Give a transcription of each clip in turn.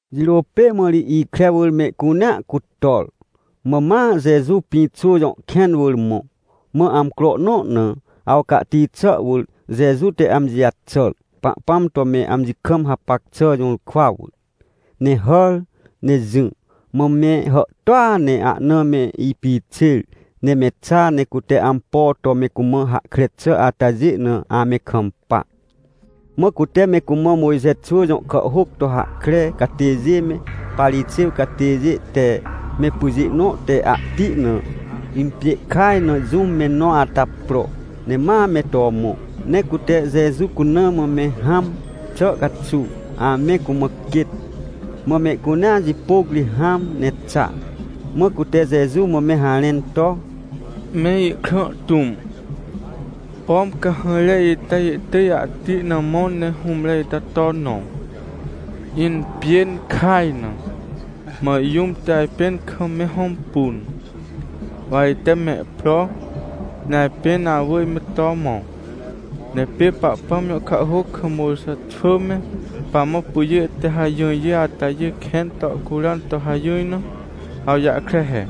Jirô pê mã ri ikre wỳr mehcunea cutor, mã ma Jeju Pĩxô jõ kẽn wỳr mõ. Mã amcro nõ na, awcahti xà wỳr, Jeju te amji jaxàr, Pahpãm to me amji kam hapac xà jũrkwa wỳr, ne hàr ne jỹ. Mã me hàhtôa ne ahna me ipixêr, ne me xa, ne cute ampo to me cumã hahkre xà atajê na ame kampa. Mã cute me cumã Mojxe xwỳ jõ kàhhôc to hahkre catêjê me, Parixêw catêjê te me pyjê nõ te ahti na impjê kaj na jũm me nõ ata pro, ne ma me to mõ. Ne cute Jeju cuna mã me hãm xà caxuw, ame cumã quêt. Mã mehcunea jipôc ri hãm ne xa. Mã cute Jeju mã me harẽn to: — Me Ikrã tũm, pom cahãjre ita ihtỳj ahti na mõ ne hũmre ita to nõ, impjên kaj na. Mã jũm te ajpẽn kam me hõmpun, wa ite mehpro, ne ajpên awỳr me to mõ. Ne pê Pahpãm jõ kàhhôc kam Mojxe xwỳ me pamã pyjê te hajỹrjê atajê kẽn to curan to hajỹr na, awjahkre he: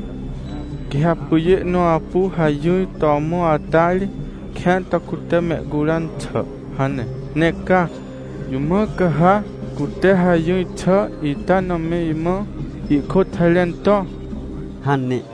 “Quê ha pyjê nõ apu hajỹr to mõ ata ri kẽan to cute mehcuran xà” hane. Ne ca? Jũ mã ca ha cute hajỹr xà ita na me imã ihkôt harẽn to? — hane.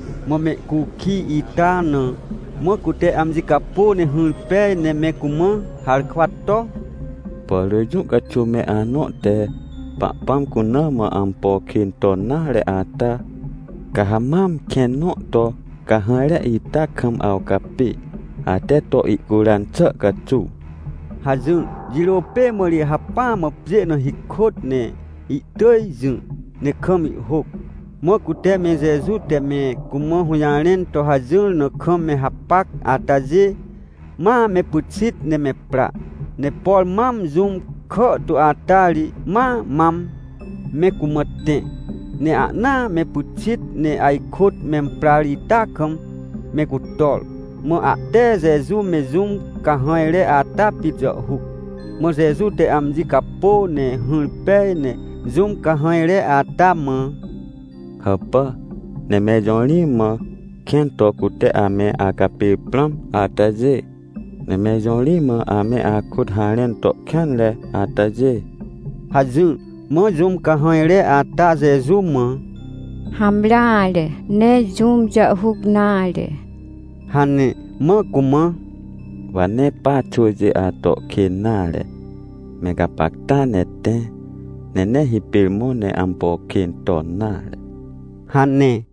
Mã mehcukij ita na. Mã cute amji capô ne hỹr pej, ne me cumã harkwa to: — Por rỳ jũ caxuw me anõ te Pahpãm cuna mã ampo kên ton nare ata, ca ha mam kẽn nõ to cahãjre ita kam awcapê, ate to ihcuran xà caxuw — hajỹr. Jirô pê mã ri hacpỹa mã pjê na hikôt, ne ihtỳj jỹ ne kam ihhôc. Mã cute me Jeju te me cumã hũjarẽn to hajỹr na kam me hapac atajê, ma me pyxit ne me pra. Ne por mam jũm kàhtu ata ri ma mam me cumã tẽ. Ne ahnaa me pyxit ne ajkôt memprar ita kam me cutor. Mã ahte Jeju me jũm cahãjre ata pit jàhhuc. Mã Jeju te amji capô ne hỹr pej, ne jũm cahãjre ata mã: — Hàpà? Ne mẽr jõ ri mã kẽn to cute ame acapêr prãm atajê? Ne mẽr jõ ri mã ame akôt harẽn to kêanre atajê? — hajỹr. Mã jũm cahãjre ata Jeju mã: — Hamreare, nee jũm jàhhuc nare — hane. Mã cumã: — Wa nee pa xwỳjê ato kên nare. Mẽr gapacta ne tẽ, ne nee hipêr mõ ne ampo kên ton nare — hane.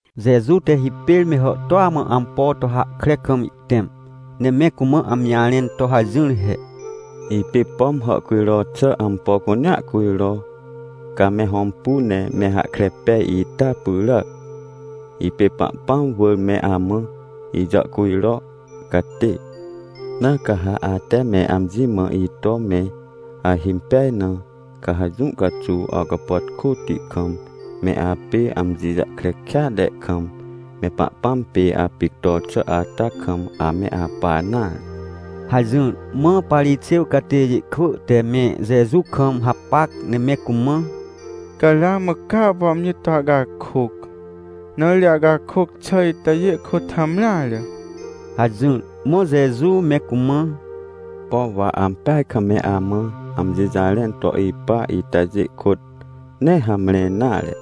Jeju te hipêr me hàhtôa mã ampo to hahkre kam ihtẽm, ne me cumã amji jarẽn to hajỹr he: — Ipê, pom hàhcujro xà ampo cunea cujro, ca me hõmpu ne me hahkre pej ita pyràac. Ipê Pahpãm wỳr me amã ijàhcujro catê. Na ca ha ate me amji mã ito me ahimpej na, ca ha jũ caxuw awcapàtkôti kam, me apê amji jahkre kêatre kam, mePahpãm pê apictor xà ata kam ame apa nare — hajỹr. Mã Parixêw catêjê kwỳ te me Jeju kam hapac ne me cumã: — Ca ramã ca apu amji to acakôc, na ri acakôc xà itajê kôt hamreare — hajỹr. Mã Jeju me cumã: — Pom wa ampeaj kam me amã amji jarẽn to ipa itajê kôt nee hamre nare.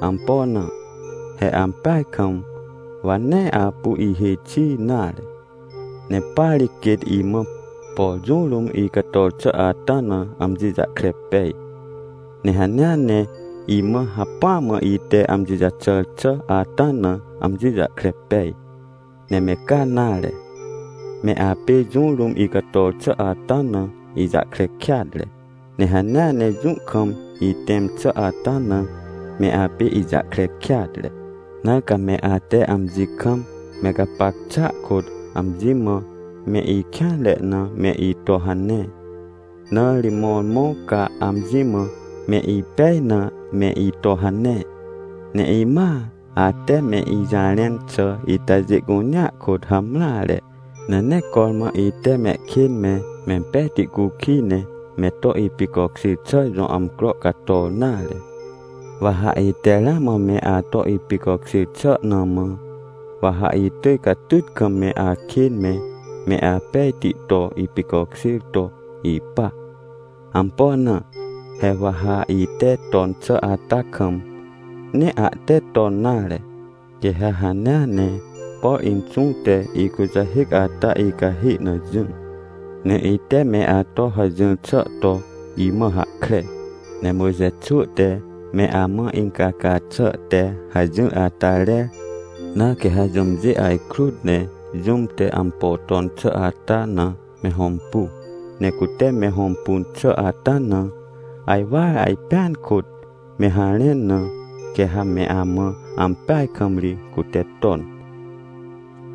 Ampo na? He ampeaj kam, wa nee apu ihêj xi nare. Ne pa ri quêt imã, por jũ rũm icator xà ata na amji jahkre pej, ne hanea ne imã hacpỹ mã ite amji jaxàr xà ata na amji jahkre pej. Ne me ca nare, me apê jũ rũm icator xà ata na ijahkre kêatre, ne hanea ne jũ kam itẽm xà ata na me apê ijahkre kêatre. Na ca me ate amji kam me gapac xàa kôt, amji mã me ikêanre na me ito hane, nare, mõrmõ ca amji mã me ipej na me ito hane. Ne imãa, ate me ijarẽn xà itajê cunea kôt hamreare. Ne nee cormã ite mehkên me, mempejti cukij ne me to ipicokjêr xà jõ amcro cator nare. Wa ha ite ramã me ato ipicokjêr xà na mã, wa ha itỳj catyt kam me akên me, me apejti to ipicokjêr to ipa. Ampo na? He wa ha ite ton xà ata kam, nee ahte ton nare. Quê ha hanea ne, por Inxũ te ikujahêc ata icahê na jỹ, ne ite me ato hajỹr xà to imã hahkre. Ne Mojxe xwỳ te me amã incaca xà te hajỹr ata rer, na quê ha jũmjê ajkrut ne jũm te ampo ton xà ata na me hõmpu, ne cute me hõmpun xà ata na ajwar ajpẽan kôt me harẽn na, quê ha me amã ampeaj kam ri cute ton.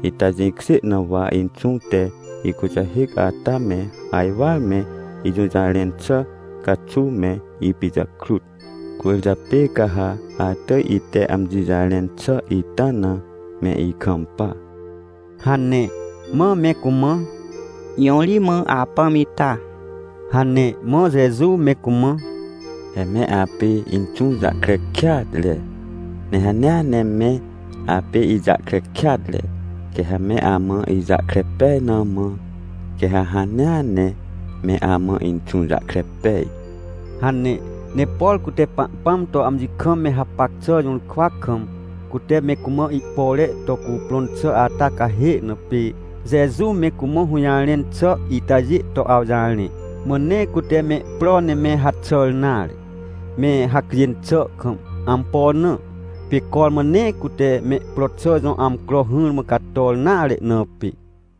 Ita jĩkjê na wa Inxũ te ikujahêc ata me ajwar me ijũjarẽn xà caxuw me ipijakrut, cwỳrjapê ca ha atỳj ite amji jarẽn xà itana me ikampa — hane. Mã me cumã: — Jõ ri mã apãm ita? — hane. Mã Jeju me cumã: — He me apê Inxũ jahkre kêatre, ne hanea ne me apê ijahkre kêatre, quê ha me amã ijahkre pej na mã, quê ha hanea ne me amã Inxũ jahkre pej — hane. Ne por cute Pahpãm to amji kam me hapac xà jũrkwa kam, cute me cumã ihpore to cuprõn xà ata cahê na, pê Jeju me cumã hũjarẽn xà itajê to awjarẽ. Mã nee cute mehpro ne me haxàr nare, me hacjên xà kam. Ampo na? Pê cormã nee cute mehpro xà jõ amcro hỹrmã cator nare, na pê.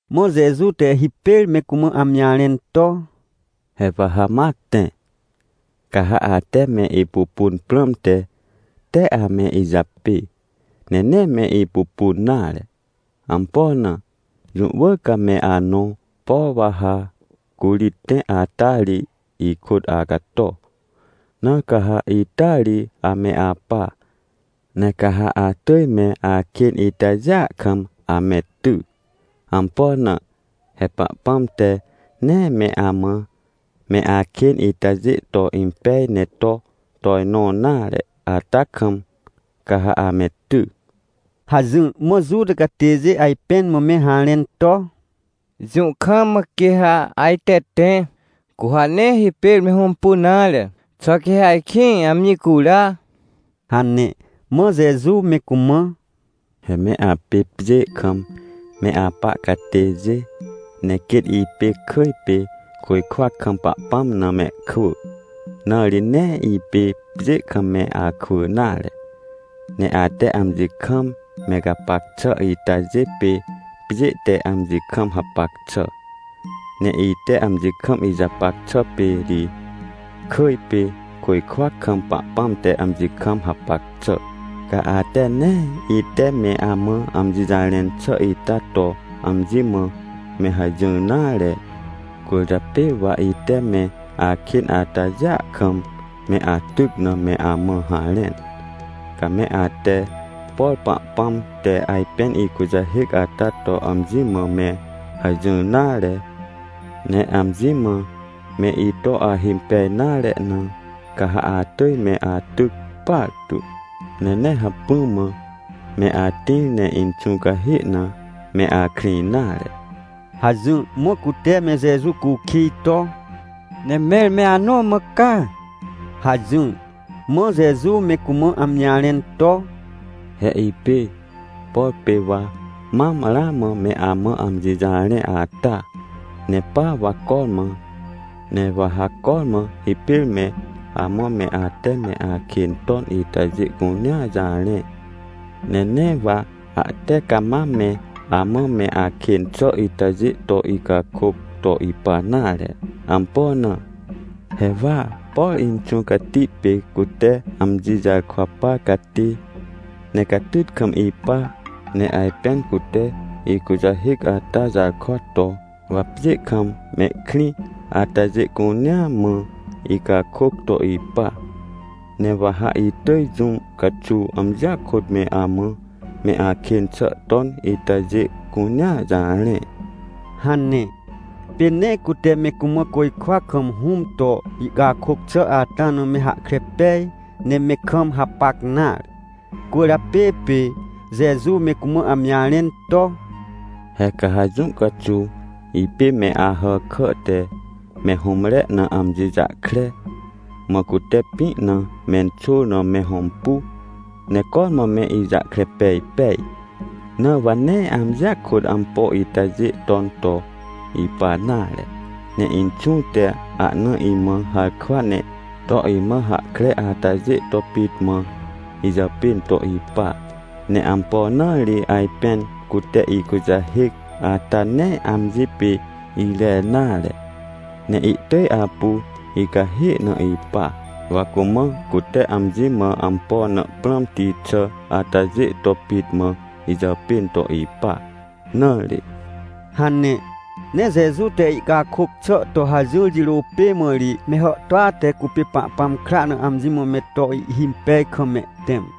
Mã Jeju te hipêr me cumã amji jarẽn to: — He wa ha ma tẽ, ca ha ate me ipupun prãmte, tee ame ijapê, ne nee me ipupun nare. Ampo na? Jũ wỳr ca me anõ, por wa ha curi tẽ ata ri, ikôt acato. Na ca ha ita ri ame apa, ne ca ha atỳj me akên itajêa kam ame ty. Ampo na? He Pahpãm te nee me amã me akên itajê to impej ne to tojnõ nare ata kam, ca ha ame ty — hajỹr. Mã Juta catêjê ajpẽn mã me harẽn to: — Jũ kam mã quê ha ajte tẽ? Cu ha nee hipêr me hõmpun nare? Xà quê ha ajkĩ amji cura? — hane. Mã Jeju me cumã: — He me apê pjê kam me apa catêjê, ne quêt ipê kỳj pê, côjkwa kam Pahpãm na mehkwỳ, na ri nee ipê pjê kam me akwỳ nare. Ne ate amji kam me gapac xà itajê pê pjê te amji kam hapac xà, ne ite amji kam ijapac xà pê ri kỳj pê, côjkwa kam, Pahpãm te amji kam hapac xà. Ca ate nee ite me amã amji jarẽn xà ita to amji mã me hajỹr nare, cwỳrjapê wa ite me akên atajêa kam me atyc na me amã harẽn. Ca me ate, por Pahpãm te ajpên ikujahêc ata to amji mã me hajỹr nare, ne amji mã me ito ahimpej nare na, ca ha atỳj me atyc partu, ne nee hacpỹa mã me atĩr ne Inxũ cahê na me akrĩ nare — hajỹr. Mã cute me Jeju cukij to: — Ne mẽr me anõ mã ca? — hajỹr. Mã Jeju me cumã amji jarẽn to: — He ipê, por pê wa mam ramã me amã amji jarẽ ata, nepa wa cormã. Ne wa ha cormã, hipêr me amã me ate me akên ton itajê cunea jarẽ. Ne nee wa ahte cama me amã me akên xà itajê to icakôc to ipa nare. Ampo na? He wa, por Inxũ Cati pê cute amji jarkwa par catê, ne catyt kam ipa, ne ajpên cute ikujahêc ata jarkwa to, wa pjê kam mehkrĩ atajê cunea mã icakôc to ipa. Ne wa ha itỳj jũ caxuw amjia kôt me amã me akên xà ton itajê cunea jarẽ — hane. Pê nee cute me cumã côjkwa kam Hũm to ihcakôc xà ata na me hahkre pej, ne me kam hapac nare. Cwỳrjapê pê Jeju me cumã amji jarẽn to: — He ca ha jũ caxuw, ipê me Ahàkà te me hũmre na amji jahkre, mã cute pĩ na menxôr na me hõmpu, ne cormã me ijahkre pej pej. Na wa nee amjia kôt ampo itajê ton to ipa nare, ne Inxũ te ahna imã harkwa ne to imã hahkre atajê to pit mã ijàpên to ipa. Ne ampo na ri ajpên cute ikujahêc ata nee amji pê irer nare, ne ihtỳj apu icahê na ipa? Wa cumã cute amji mã ampo na prãmti xà atajê to pit mã ijàpên to ipa na ri — hane. Ne Jeju te ihcakôc xà to hajỹr jirô pê mã ri me hàhtôa te cupê Pahpãm kra na amji mã me to ihhimpej kam mehtẽm.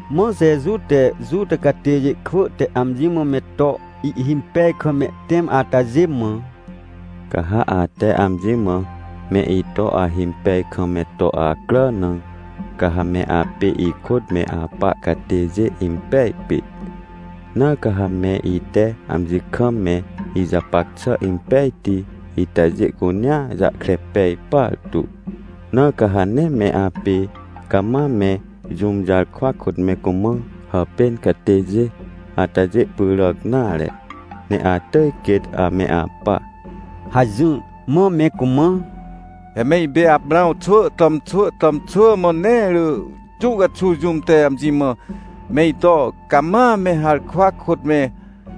Mã Jeju te Juta catêjê kwỳ te amji mã me to ihhimpej kam mehtẽm atajê mã: — Ca ha ate amji mã me ito ahimpej kam me to acrà na, ca ha me apê ikôt me apa catêjê impej pit. Na ca ha me ite amji kam me ijapac xà impejti itajê cunea jahkre pej partu. Na ca ha nee me apê cama me jũm jarkwa kôt me cumã hàpên catêjê atajê pyràc nare, ne atỳj quêt ame apa — hajỹr. Mã me cumã: — He me ipê Aprãw xwỳ tàmxwỳ tàmxwỳ, mã nee rỳ jũ caxuw jũm te amji mã me ito cama me harkwa kôt me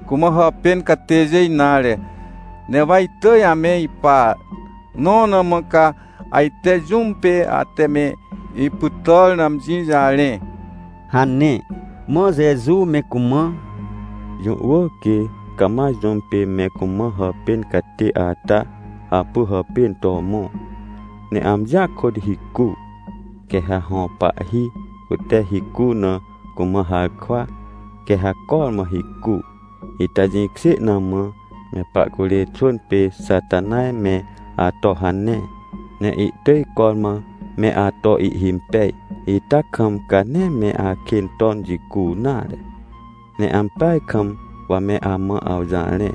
cumã hàpên catêjê nare, ne wa itỳj ame ipa, nõ na mã ca ajte jũm pê ate me ipytàr na amji jarẽ? — hane. Mã Jeju me cumã: — Jũ wỳr quê cama jũm pê me cumã hàpên catê ata apu hàpên to mõ, ne amjia kôt hicu. Quê ha hõ pahhi cute hicu na cumã harkwa, quê ha cormã hicu. Ita jĩkjê na mã, me pahcurê xwỳn pê Xatanaj me ato hane, ne ihtỳj cormã me ato ihhimpej ita kam, ca nee me akên ton jicu nare. Ne ampeaj kam wa me amã awjarẽ,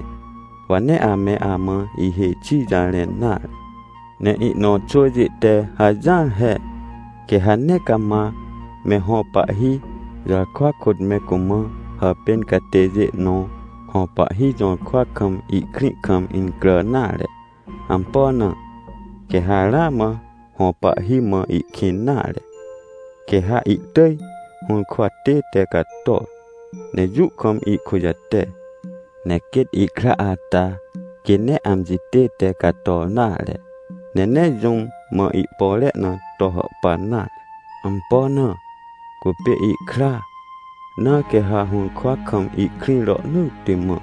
wa nee ame amã ihêj xi jarẽn nare. Ne ihnõ xwỳjê te hajỹar he. Quê ha nee cama me hõ pahhi jarkwa kôt me cumã hàpên catêjê nõ hõ pahhi jũrkwa kam ihkrĩ kam incrà nare. Ampo na? Quê ha ramã hõ pahhi mã ihkĩn nare, quê ha ihtỳj hũrkwa tête cator, ne jũ kam ihkujate. Ne quêt ihkra ata quê nee amji tête cator nare, ne nee jũm mã ihpore na to hàhpan nare. Ampo na? Cupê ihkra, na quê ha hũrkwa kam ihkrĩ rohnỳtti mã.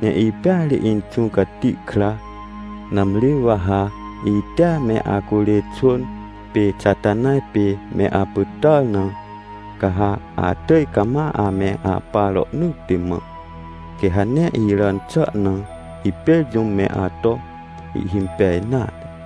Ne ipêa ri Inxũ Cati kra. Nãmri wa ha itea me acurê xwỳn pê Xatanaj pê me apytàr na, ca ha atỳj cama ame apa rohnỳtti mã, quê ha nee iràn xà na hipêr jũm me ato ihhimpej nare.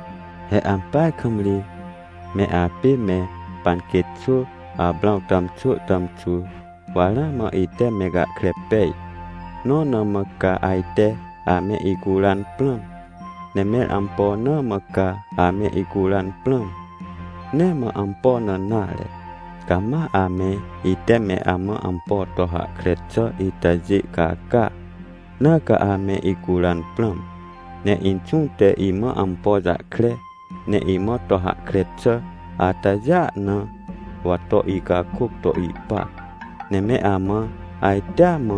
— He ampeaj kam ri me apê me panquêt xwỳ Aprãw tàmxwỳ tàmxwỳ, wa ramã ite me gahkre pej. Nõ na mã ca ajte ame icuran prãm. Ne mẽr ampo na mã ca ame icuran prãm? Nee mã ampo na nare, ca ma ame ite me amã ampo to hahkre xà itajê caca, na ca ame icuran prãm. Ne Inxũ te imã ampo jahkre, ne imã to hahkre xà atajêa na wa to icakôc to ipa. Ne me amã ajtea mã,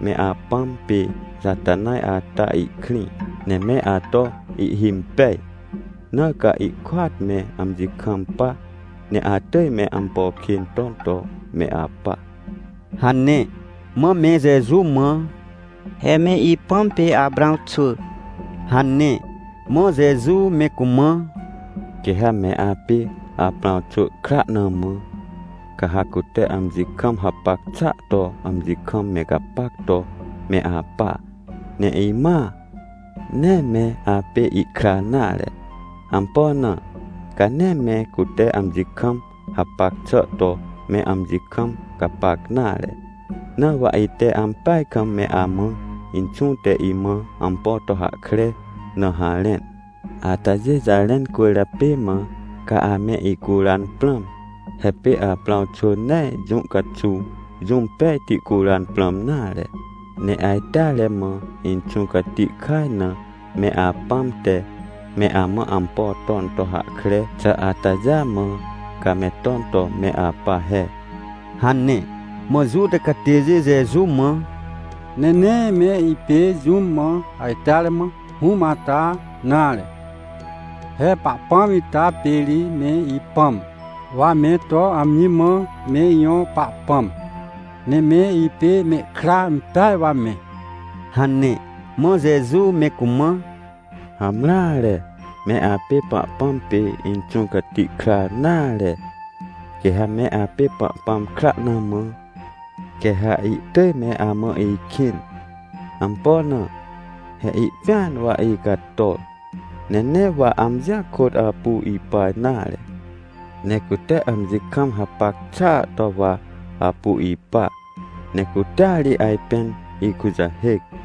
me apãm pê Xatanaj ata ihkrĩ, ne me ato ihhimpej. Na ca ihkôat me amji kampa, ne atỳj me ampo kên ton to me apa — hane. Mã me Jeju mã: — He me ipãm pê Aprãw xwỳ — hane. Mã Jeju me cumã: — Quê ha me apê Aprãw xwỳ kra na mã, ca ha cute amji kam hapac xàa to amji kam me gapac to me apa. Ne imãa, nee me apê ihkra nare. Ampo na? Ca nee me cute amji kam hapac xà to me amji kam gapac nare. Na wa ite ampeaj kam me amã Inxũ te imã ampo to hahkre na harẽn. Atajê jarẽn cwỳrjapê mã, ca ame icuran prãm. He pê Aprãw xwỳ nee jũ caxuw jũm pejti curan prãm nare. Ne ajteare mã, Inxũ Cati kaj na me apãm te me amã ampo ton to hahkre xà atajêa mã, ca me ton to me apa he — hane. Mã Juta catêjê Jeju mã: — Ne nee me ipê jũm mã ajteare mã hũm ata nare. He Pahpãm ita pê ri me ipãm, wa me to amji mã me ijõ Pahpãm, ne me ipê mehkra impeaj wa me — hane. Mã Jeju me cumã: — Hamreare, me apê Pahpãm pê Inxũ Cati kra nare. Quê ha me apê Pahpãm kra na mã, quê ha ihtỳj me amã ikĩn. Ampo na? He ihpĩan wa icator. Ne nee wa amjia kôt apu ipa nare, ne cute amji kam hapac xàa to wa apu ipa. Ne cutea ri ajpên ikujahêc.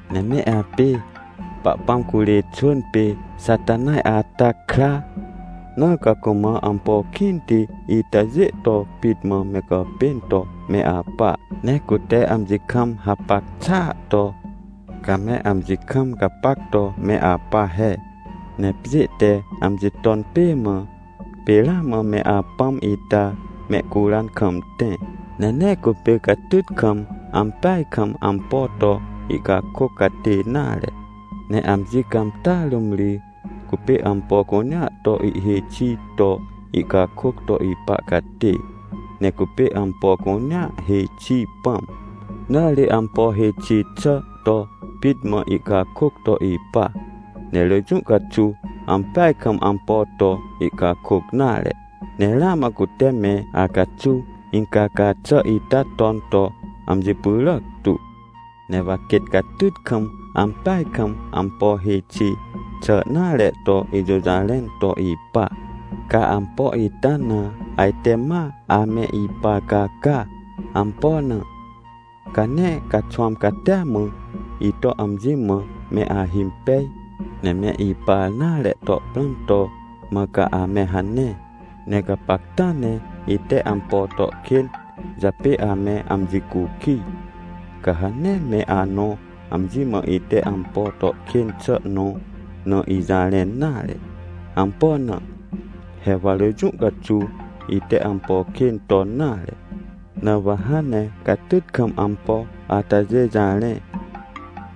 Ne me apê Pahpãm curê xwỳn pê Xatanaj ata kra, na ca cumã ampo kĩnti itajê to pit mã me gàpên to me apa. Ne cute amji kam hapac xà ato, ca me amji kam gapac to me apa he. Ne pjê te amji ton pê mã, pê ramã me apãm ita mehcuran kam tẽ. Ne nee cupê catyt kam, ampeaj kam ampo to ihcakôc catê nare, ne amji cãmtàa rũm ri cupê ampo cunea to ihhêj xi to ihcakôc to ipa catê. Ne cupê ampo cunea hêj xi pãm, na ri ampo hêj xi xà to pit mã ihcakôc to ipa. Ne rỳ jũ caxuw ampeaj kam ampo to ihcakôc nare. Ne ramã cute me acaxuw incaca xà ita ton to amji pyràc tu. Ne wa quêt catyt kam, ampeaj kam ampo hêj xi xà nare to ijũjarẽn to ipa, ca ampo ita na ajte ma ame ipar caca. Ampo na? Ca nee caxwãm catia mã ito amji mã me ahimpej, ne me ipar nare to prãm to mã ca ame hane. Ne gapacta ne ite ampo to kên japê ame amji cukij, ca ha nee me anõ amji mã ite ampo to kên xà nõ na ijarẽn nare. Ampo na? He wa rỳ jũ caxuw ite ampo kên ton nare. Na wa hãn ne catyt kam ampo atajê jarẽ,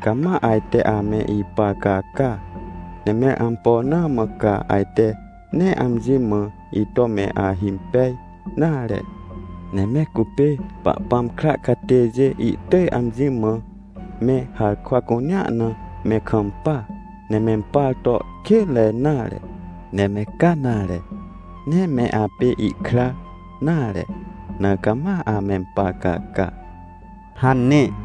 ca ma ajte ame ipar caca. Ne mẽr ampo na mã ca ajte nee amji mã ito me ahimpej nare? Ne me cupê Pahpãm kra catêjê ihtỳj amji mã me harkwa cunea na me kampa, ne mempar to kênre nare. Ne me ca nare, nee me apê ihkra nare, na ca ma amempar caca — hane.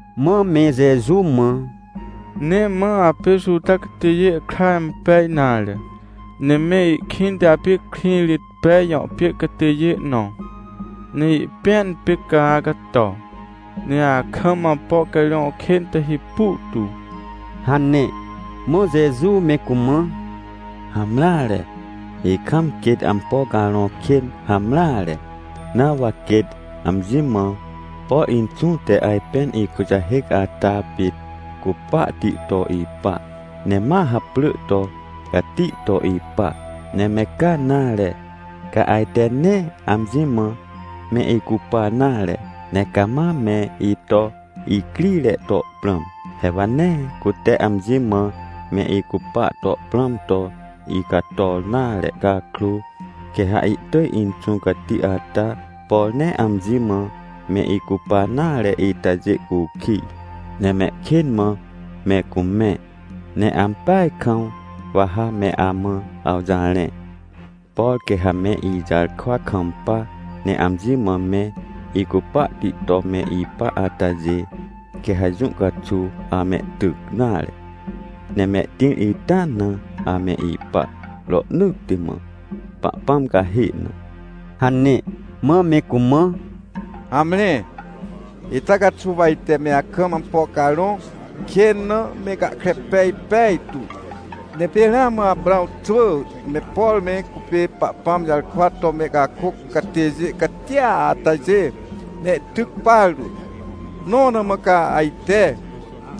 Mã me Jeju mã: — Nee mã apê Juta catêjê kra impeaj nare, ne me ikĩnte apê Krĩrĩtpej jõ pjê catêjê nõ, ne ihpĩan pê ca acato, ne akam ampo carõ kên te hipu tu — hane. Mã Jeju me cumã: — Hamreare, ikam quêt ampo carõ kên hamreare, na wa quêt amji mã, por Inxũ te ajpên ikujahêc ata pit cupahti to ipa, ne ma haprỳ to cati to ipa. Ne me ca nare, ca ajte nee amji mã me icupa nare, ne cama me ito icrire to prãm. He wa nee cute amji mã me icupa to prãm to icator nare cakrô, quê ha ihtỳj Inxũ Cati ata, por nee amji mã me icupa nare itajê cukij, ne mehkên mã me cumẽ. Ne ampeaj kam wa ha me amã awjarẽ. Por quê ha me ijarkwa kampa, ne amji mã me icupahti to me ipa atajê, quê ha jũ caxuw amehtyc nare, ne mehtĩr ita na ame ipa rohnỳtti mã, Pahpãm cahê na — hane. Mã me cumã: — Hamre, ita caxuw wa ite me akam ampo carõ kên na me gahkre pej pejtu. Ne pê ramã Aprãw xwỳ me, por me cupê Pahpãm jarkwa to mehcakôc catêjê catia atajê mehtyc partu. Nõ na mã ca ajte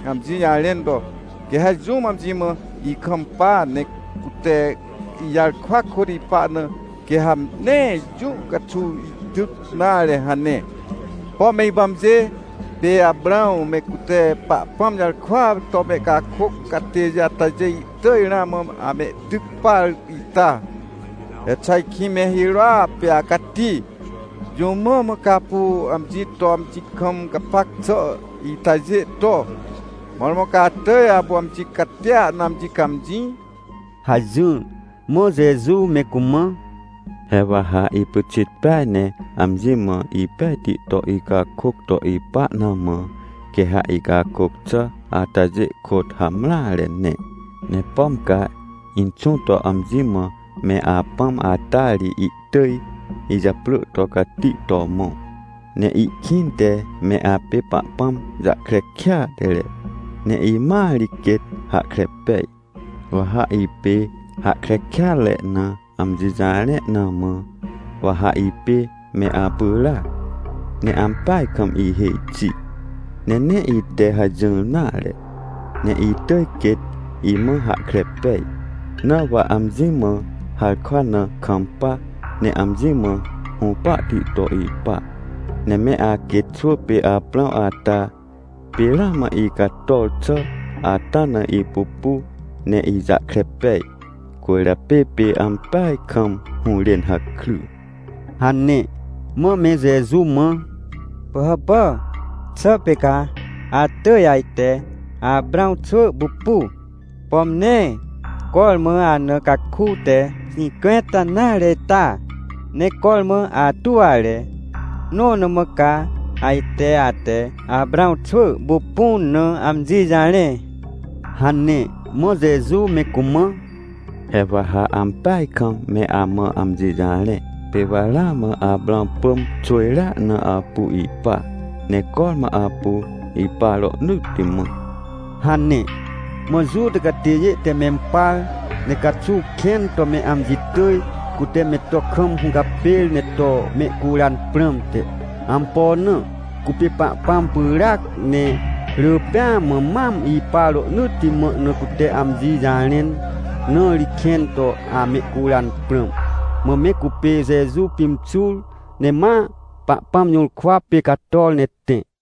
amji jarẽn to: “Quê ha jũm amji mã ikampa, ne cute ijarkwa kôt ipa na, quê ha nee jũ caxuw ihtyc nare” hane? Pom me ipãmjê pê Aprãw me, cute Pahpãm jarkwa to mehcakôc catêjê atajê ihtỳj ramã amehtyc par ita? He xà ajkĩ me hirôa pê acati? Jũ mã mã ca apu amji to, amji kam gapac xà itajê to? Mõrmõ ca atỳj apu amji catia na amji cãmjĩ? — hajỹr. Mã Jeju me cumã: — He wa ha ipyxit peaj ne amji mã ipejti to icakôc to ipa na mã, quê ha icakôc xà atajê kôt hamreare ne. Ne pom ca Inxũ to amji mã me Apãm ata ri ihtỳj ijaprỳ to cati to mõ. Ne ikĩnte me apê Pahpãm jahkre kêatre, ne imãa ri quêt hahkre pej. Wa ha ipê hahkre kêatre na amji jarẽ na mã, wa ha ipê me apyràac ne ampeaj kam ihêj xi. Ne nee ite hajỹr nare, ne itỳj quêt imã hahkre pej, na wa amji mã harkwa na kampa, ne amji mã hũpahti to ipa. Ne me aquêt xwỳ pê Aprãw ata pê ramã icator xà ata na ipupu ne ijahkre pej, cwỳrjapê pê ampeaj kam hũrên hakry — hane. Mã me Jeju mã: — Pỳhàpà? Xà pê ca atỳj ajte Aprãw xwỳ pupu? Pom nee cormã ana caku te xĩncwẽnta nare ita? Ne cormã atuwre, nõ na mã ca ajte ate Aprãw xwỳ pupun na amji jarẽ? — hane. Mã Jeju me cumã: — He wa ha ampeaj kam me amã amji jarẽ. Pê wa ramã Aprãw pỳm xwỳjrea na apu ipa, ne cormã apu ipa rohnỳtti mã — hane. Mã Juta catêjê te mempar, ne caxuw kẽn to me amji tỳj, cute me to kam hũcapêr, ne to mehcuran prãmte. Ampo na? Cupê Pahpãm pyràac ne rỳ pêa mã mam ipa rohnỳtti mã na cute amji jarẽn, na ri kẽn to amehcuran prãm. Mã me cupê Jeju pimxur ne ma Pahpãm jũrkwa pê cator ne tẽ.